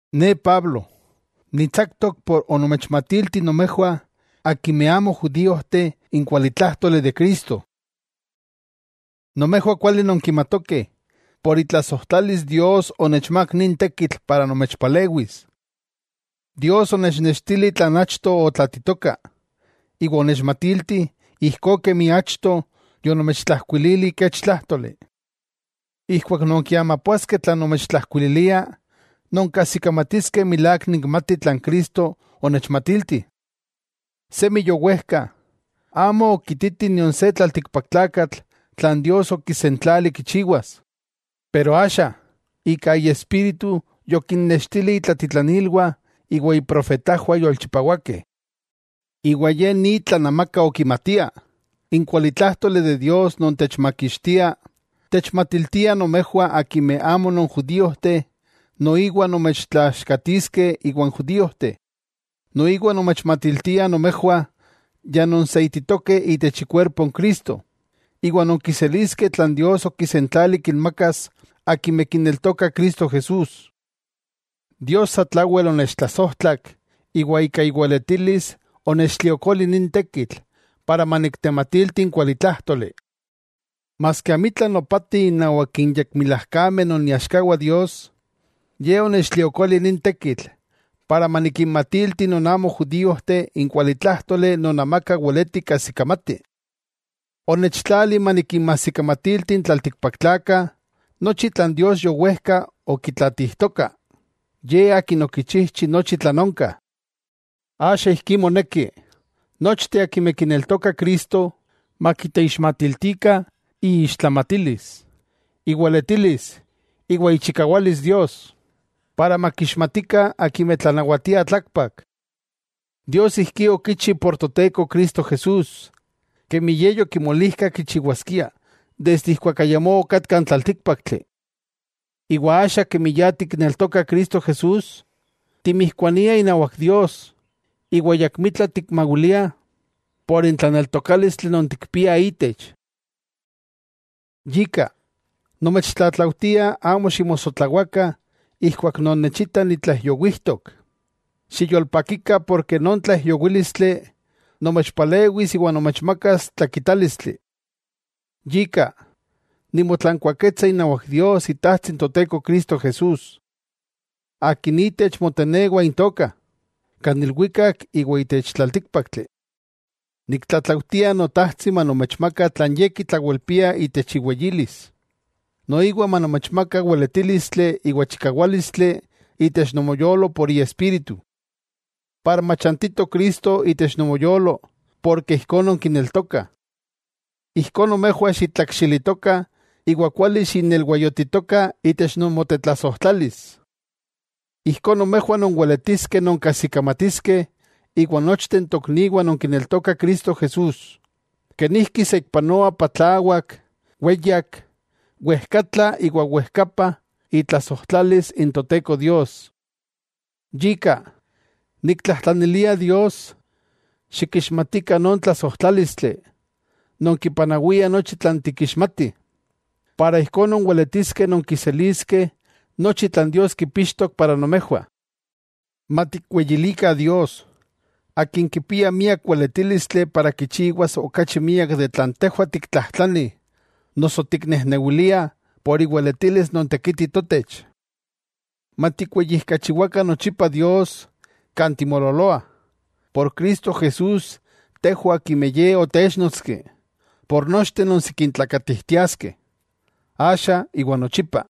Ne Pablo, ni tsaktok por onomechmatilti nomejwah akimeh amo judíojteh n kualitlájtoli de Cristo. Nomejwah kuali nonkimatokeh, por itlasojtlalis Dios onechmák nin tekitl para nomechpalewis. Dios onechnextili tlan achto otlaatitoka, iwa onechmatilti, ijkó kemi achto yonomechtlajkuilili kech tlájtoli. Ijkuak non kiamapoaskeh tlan nomechtlajkuililia, nonkajsikamatiskeh milák nikmati tlan Cristo onechmatilti. Semi yowejka, amo okititi nion se tlaltikpaktlakatl tlan Dios okisentlali kichiwas. Pero axa, ika Iespíritu yokinnextili itlatitlanilwah iwa iprofetajwah yolchipawakeh. Iwa ye ni tlan amaka okimatia: n kualitlájtoli de Dios non techmakixtia, techmatiltia nomejwah akimeh amo non judíojteh noiwa nomechtlaaxkatiskeh iwan judíojteh. Noiwa nomechmatiltia nomejwah ya nonseititokeh itech ikuerpo n Cristo, iwa nonkiseliskeh tlan Dios okisentlali kinmakas akimeh kineltokah Cristo Jesús. Dios satlawel onechtlasojtlak iwa ika iweletilis onechtliokoli nin tekitl para maniktematilti n kualitlájtoli. Maski amitla nopati innawak n yekmilajkameh non iaxkawah Dios, Ye onechtliokoli nin tekitl para manikinmatilti non amo judíojteh n kualitlájtoli non amaka weleti kajsikamati. Onechtlali manikinmajsikamatilti n tlaltikpaktlakah nochi tlan Dios yowejka okitlatijtoka, Ye Akin okichijchi nochi tlan onka. Axa ijkí moneki, nochteh akimeh kineltokah Cristo, makiteixmatiltikah iixtlamatilis, iweletilis iwa ichikawalis Dios, para makixmatikah akimeh tlanawatiah tlakpak. Dios ijkí okichi por Toteko Cristo Jesús, kemi Ye yokimolijka kichiwaskia desde ijkuak ayamó okatka n tlaltíkpaktli. Iwa axa kemi ya tikneltokah Cristo Jesús, timijkuaniah inawak Dios, iwa ayakmitla tikmawiliah por n tlaneltokálistli non tikpiah itech. Yika, nomechtlatlaujtia amo ximosotlawakah ijkuak nonnechitah nitlaijyowijtok, xiyolpakikah porke non tlaijyowílistli nomechpalewis iwa nomechmaka tlakitálistli. Yika, nimotlankuaketsa inawak Dios Itajtsi n Toteko Cristo Jesús. Akin itech motenewah intokah, kan ilwikak iwa itech tlaltíkpaktli. Niktlatlaujtia Notajtsi manomechmaka tlan Ye kitlawelpia itech iweyilis, noiwa manomechmaka weletílistli iwa chikawálistli itech nomoyolo por Iespíritu, para machantito Cristo itech nomoyolo porke ijkó nonkineltokah. Ijkó nomejwah xitlakxilitokah iwa kuali xinelwayotitokah itech nomotetlasojtlalis. Ijkó nomejwah nonweletiskeh nonkajsikamatiskeh iwan nochteh n tokniwah non kineltokah Cristo Jesús, kenijki saikpanoa patlawak weyak wejkatla iwa wejkapa itlasojtlalis n Toteko Dios. Yika, niktlajtlanilia Dios, xikixmatikah non tlasojtlálistli, non kipanawia nochi tlan tikixmatih, para ijkó nonweletiskeh nonkiseliskeh nochi tlan Dios kipixtok para nomejwah. Matikweyilikah Dios, Akin kipia miak weletílistli para kichiwas okachi miak de tlan tejwah tiktlajtlani noso tiknejnewiliah por iweletilis non tekiti totech. ¡Matikweyijkachiwakah nochipa Dios kan timololoah, por Cristo Jesús tejwah akimeh Ye otéchnotski, por nochteh non sikin tlakatijtiaskeh, axa iwa nochipa!